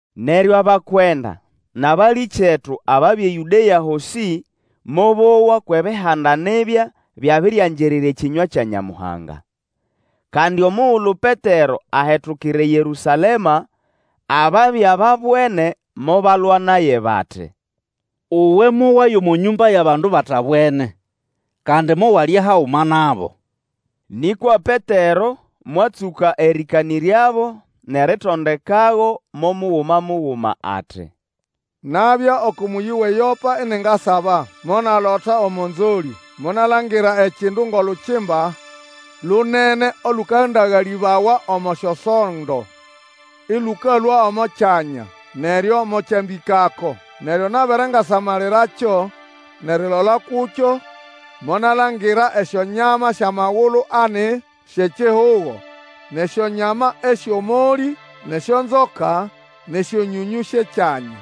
Neryo abakwenda nʼabalĩkyetu ababya eYũdea hosĩ mobowa kwʼEbihanda nibya byabiriangirira ekĩnywa kya Nyamuhanga. Kandi omugulu Petero ahetukira eYerũsalema, ababya babwene mobalwa naye, bati, Uwe mowaya omo nyũmba yʼabandu batabwene, kandi mowalya haguma nabo. Nĩkwa Petero mwatsũka erĩkanĩryabo, nʼeritondekago mo muguma muguma, ati, Nabya oko mũyĩ wʼeYopa iningasaba. Monalota omo nzolĩ. Monalangira ekindu ngʼolukimba lunene olũkandagalĩbawa omo syosondo, ĩlũkalũa omo kyanya, neryo mokyambĩkako. Neryo nabere ngasamalirakyo, nʼerilola kukyo, monalangira esyonyama syʼamagulu ani syʼekihugo, nʼesyonyama esyʼomolĩ nʼesyonzoka, nʼesyonyonyũ syʼekyanya.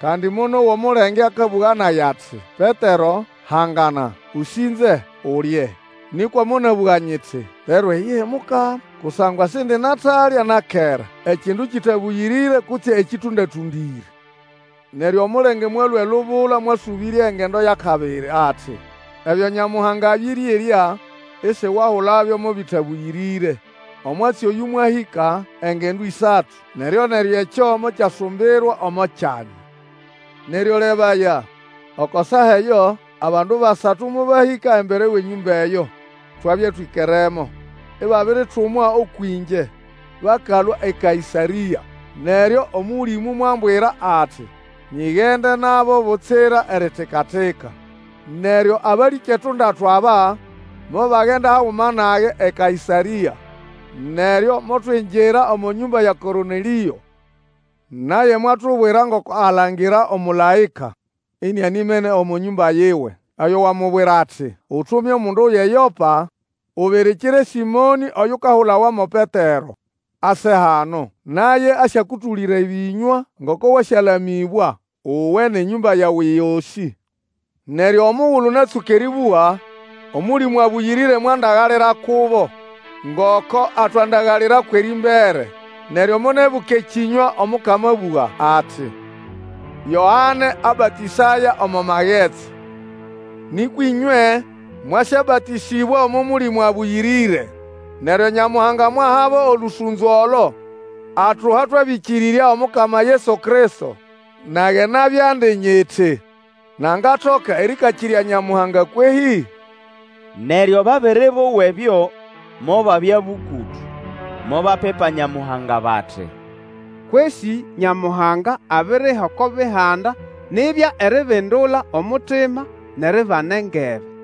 Kandi monowa omulenge akabũga nage ati, Petero, hangana, ũsĩnze, ulye! Nĩkwa monabũga nyiti, Lero iyihi Mukama! Kusangwa sindinatalya na kera ekindu kĩtabũyĩrĩre kutse ekĩtũndatũndĩre. Neryo omulenge mwalũa elubula mwasũbĩrya engendo yʼakabiri ati, Ebyo Nyamuhanga abĩrĩerya, isiwahulabyo mo bĩtabũyĩrĩre. Omwatsi oyũ mwahĩka engendo ĩsatu, neryo-neryo ekyo mokyasumbirwa omo kyanya. Neryo lebaya, oko saa eyo; abandu basatu mobahĩka embere wʼenyũmba eyo twabya twĩkeremo, ibabiritumwa ũkwʼĩngye bakalũa eKaĩsarĩa. Neryo Omũlĩmũ mwambwira ati, nyigende nabo butsira eritika-tika. Neryo abalĩkyetu ndatu aba mobagenda haguma nage eKaĩsarĩa, neryo motwingira omo nyũmba ya Kornelĩo. Naye mwatubwira ngoko alangira omũlaĩka inianimene omo nyũmba yiwe, oyo wamubwira ati, Utume omundu yʼeYopa ubirikire Sĩmonĩ oyukahulawa mo Petero, ase hano; Naye asyakũtũlĩra ebĩnywa ngoko wasyalamĩbwa, uwe nʼenyũmba yawe yosĩ. Neryo omugulu natsũka erĩbũga, Omũlĩmũ Abũyĩrĩre mwandagalira kubo ngoko atwandagalirako erĩmbere. Neryo monibuka ekĩnywa Omukama abũga ati, Yoane abatĩsaya omo magetsi, nĩkwa ĩnywe mwasyabatĩsĩbwa omo Mũlĩmũ Abũyĩrĩre. Neryo Nyamuhanga mwahabo olũsũnzo olo atuha twabĩkĩrĩrya Omukama Yesu Kristo, nage nabyandi nyiti nangatoka erĩkakĩrya Nyamuhanga kwehĩ? Neryo babere bowa ebyo, mobabya bũkũtũ, mobapipa Nyamuhanga bati, Kwesĩ, Nyamuhanga abiriha oko Bihanda nibya eribindula omutima nʼeribana engebe.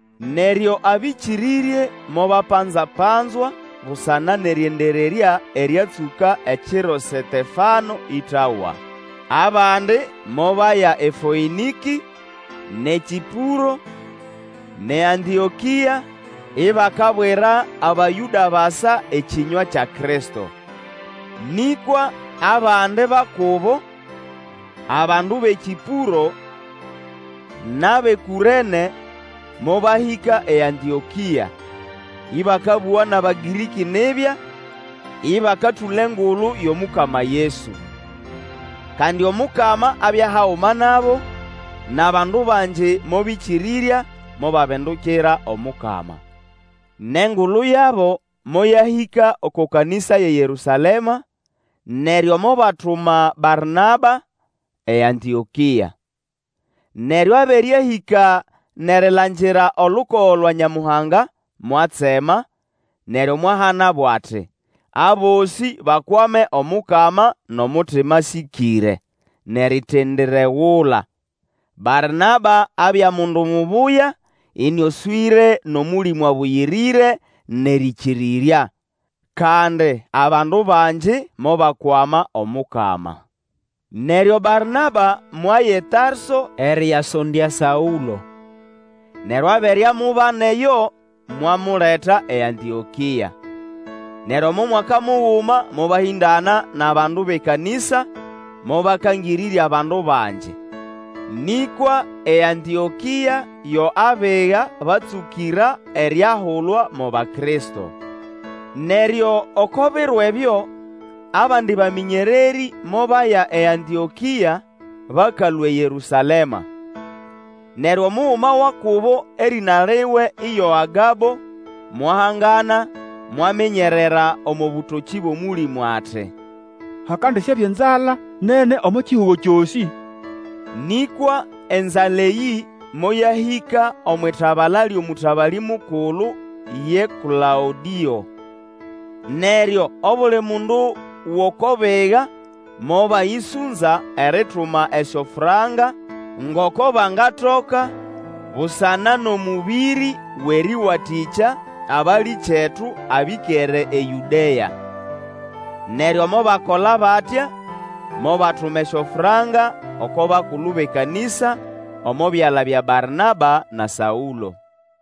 Neryo abĩkĩrĩrye mobapanza-panzwa busana nʼerĩendererya eryatsũka ekiro Setefano ĩtawa. Abandi mobaya eFoĩnĩkĩ, nʼeKĩpũro, nʼeAntĩokĩa, ibakabwira Abayũda basa ekĩnywa kya Kristo. Nĩkwa abandi ba kubo, abandu bʼeKĩpũro, nʼabʼeKũrene, mobahĩka eAntĩokĩa, ĩbakabũga nʼAbagĩrĩkĩ nibya, ĩbakatũla Engulu yʼomukama Yesu. Kandi Omukama abya haguma nabo, nʼabandu bangi mobĩkĩrĩrya mobabindukira Omukama. Nʼengulu yabo moyahĩka oko kanĩsa yʼeYerũsalema, neryo mobatuma Barnaba eAntĩokĩa. Neryo abere ahĩka nʼerilangira olukogo lwa Nyamuhanga, mwatsema, neryo mwahanabo ati, abosĩ bakwame Omukama nʼomutima asĩkĩre, nʼeritendiregula. Barnaba abya mundu mubuya, ĩnĩoswĩre nʼOmũlĩmũ Abũyĩrĩre nʼerĩkĩrĩrya. Kandi abandu bangi mobakwama Omukama. Neryo Barnaba mwaya eTarso erĩyasondya Saũlo. Neryo abere amubana eyo mwamuleta eAntĩokĩa. Neryo omo mwaka muguma mobahĩndana nʼabandu bʼekanĩsa, mobakangĩrĩrya abandu bangi. Nĩkwa eAntĩokĩa yo abiga batsũkĩra eriahulwa mo Bakristo. Neryo oko biro ebyo, abandi bamĩnyererĩ mobaya eAntĩokĩa bakalũa eYerũsalema. Neryo omuguma wa kubo erĩna liwe iyo Agabo, mwahangana, mwaminyerera omo bũtokĩ bʼOmũlĩmũ ati, Hakandisyabya enzala nene omo kihugo kyosĩ. Nĩkwa enzala eyĩ moyahĩka omwʼitabala lyʼomũtabalĩ mukulu ye Klaũdĩo. Neryo obuli mundu wʼoko biga mobayĩsũnza erituma esyofranka ngoko bangatoka busana nʼomũbĩrĩ wʼerĩwatĩkya abalĩkyetu abĩkere eYũdea. Neryo mobakola batya, mobatuma esyofranka oko bakulu bʼekanĩsa omo byala bya Barnaba na Saũlo.